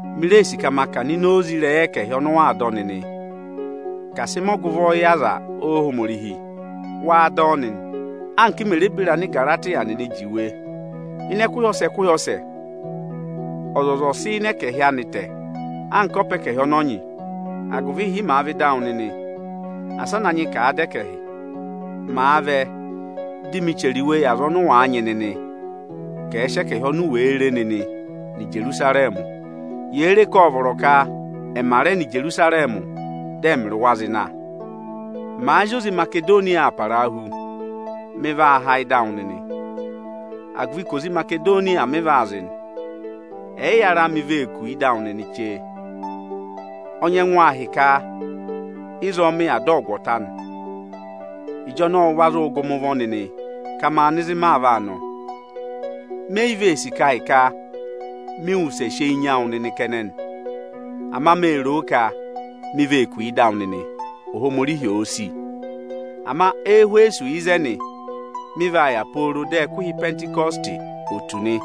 Mi ree sì ka ma kà ọ̀nọ̀ ịnị ịrẹyị oze ẹkẹhị ọnị ụ waa dọ nịnị ka à sị na mẹ ọgụvọ yị aza Ohomorihi. Waa dọ ọ nịnị anka m mè re beri Anigaratiya nịnị juwe. Ịnị ẹkụhị ọsẹ ẹkụhị ọsẹ, ọzọza ọ̀ọ sị ịnị ẹkẹhị anịị tẹ̀, anka ọpa ẹkẹhị ọnị ọ nyị; agụvị ịhị màa vẹ ịdị awụ nịnị, asị a na nyị ka àa dọ ẹkẹhị. Màa vẹ, dị mị chẹrẹ iwe yị aza ọnị ụ wàa nyị nịnị ka ẹ̀ sị ẹkẹhị oni u wèe re nịnị nọ Ijerusarẹmị. Yèe re ka ộ vọrọ ka ẹmà rẹ nọ Ijerusarẹmị, dị ẹmịrị wa zị na. Màa zị oze Imasedoniya aa parahu, mị vaa há ịdị awụ nịnị, agụvị ka oze Imasedoniya mị vaa zị nị. Ẹyịyara mi vee kù ịdị awụ nịnị chee. Ọnyẹngụ ahịka ịzọọ mị yà dị ọgụ ọ̀ ta nị. Ịjọnọọ ụ va zụụ gụ mị ụvọ nịnị ka ma nọ ịzị màa vaa nọ. Me yi vee sì ka ahịka mị wụsẹ va sị eyi nya wụ nịnị kẹnẹ nị. Ama mee ro ka mi vee kù ịdị awụ nịnị, Ohomorihi òo sì. Ama Ẹhwẹsọsị ịzẹnị mị vaa yà pooro dị ẹkụhị Ịpẹntịkọsịtị ò tù nị.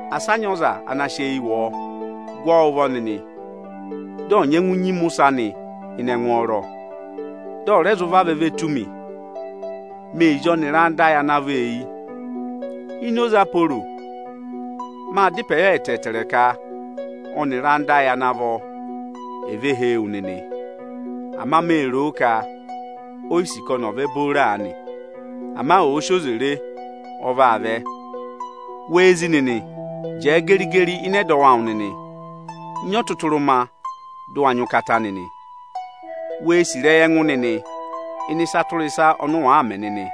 Asị a nyị ọza ana sị eyi wụ ọọ o! Gụ ọ ụvọ nịnị, dị ọ̀ nyẹngụ nyima ụsẹ anị ịnị ẹngwọọrọ, dị ọ̀ rẹ zụ vavẹ ve tù mi. Mee zí ọnịrị ẹyịnyara ayị ana vọ eyi. Ịnị ịrẹyị ẹnẹbẹnị ayị Aporo, mâ da ịpẹ yọ ẹtẹẹtẹrẹ ka ọnịrị ẹyịnyara ayị ana vọ è ve hee wu nịnị. Ama mee ro ka o yi sì ka ọnị ọ̀ vẹ booro aanị. Ama òo si oze re, ọ vaa vẹ. Wee zi nịnị, jẹẹ geri-geri ịnị ẹdọwụ awụ nịnị, nyị ọtụtụrụma, dị ụ wa nyị ụkata nịnị! Wee sì ịrẹyị ẹngụ nịnị ịnị ịsa tụra ịsa ọnị ụ wàa mẹ nịnị!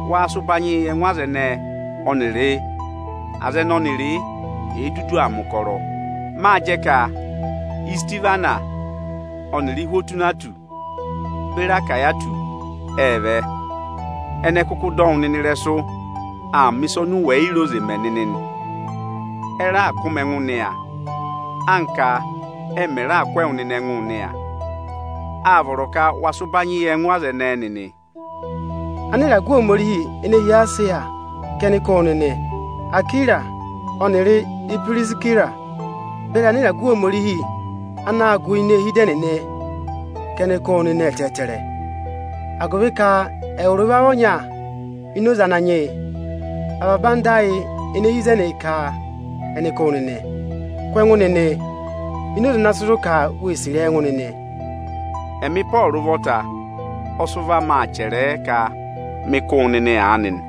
waa sị ụbanyịị yị ẹngụ aza ẹnẹẹ ọnịrị aza ẹnị ọnịrịị èe dudu aa mẹ̀ ụkọrọ. Mâ jẹ m mè re ka Isitihwanasị ọnịrị Ihwotunatọsị beri Achayikọsị ệ vẹ. Ẹnị ẹ kụkụ dọ wụ nịnị ịrẹsụ aa mẹ̀ ịsa oni u wè yi re oze mẹ nịnị nị. Ẹ raà kụ́ mị ẹngụ nịya, anka ẹ mẹ̀ rẹ kụ́ ẹwụ nịnị ẹngụ nịya. Â vọrọ ka wa sị ụbanyị yị ẹngụ aza ẹnẹẹ nịnị! Anịragụ Ohomorihi ene hi Esiya, ka ẹnị kụ́ wụ nịnị. Akwira ọnịrị Ipirisira beri anịragụ Ohomorihi anaā gụ ini eehi ịdị ẹnịnị ka ẹnị kụ́ wụ nịnị ẹtẹẹtẹrẹ, agụvị ka ẹwụrị wa vị ọnya ini oze Ananyị yị. Avaba ẹyịnyara ayị ene hi ịzẹnị ka ẹnị kụ́ wụ. Waa kụ́ ẹngụ nịnị ini oze ọnịnị ana sị zụ̀ ka wee sì ịrẹyị ẹngụ nịnị. Ẹmị Ịpọọrụ ụvọta ọ sị ụvọ amị chẹrẹ ẹ ka maa kụ́ wụ nịnị aanị nị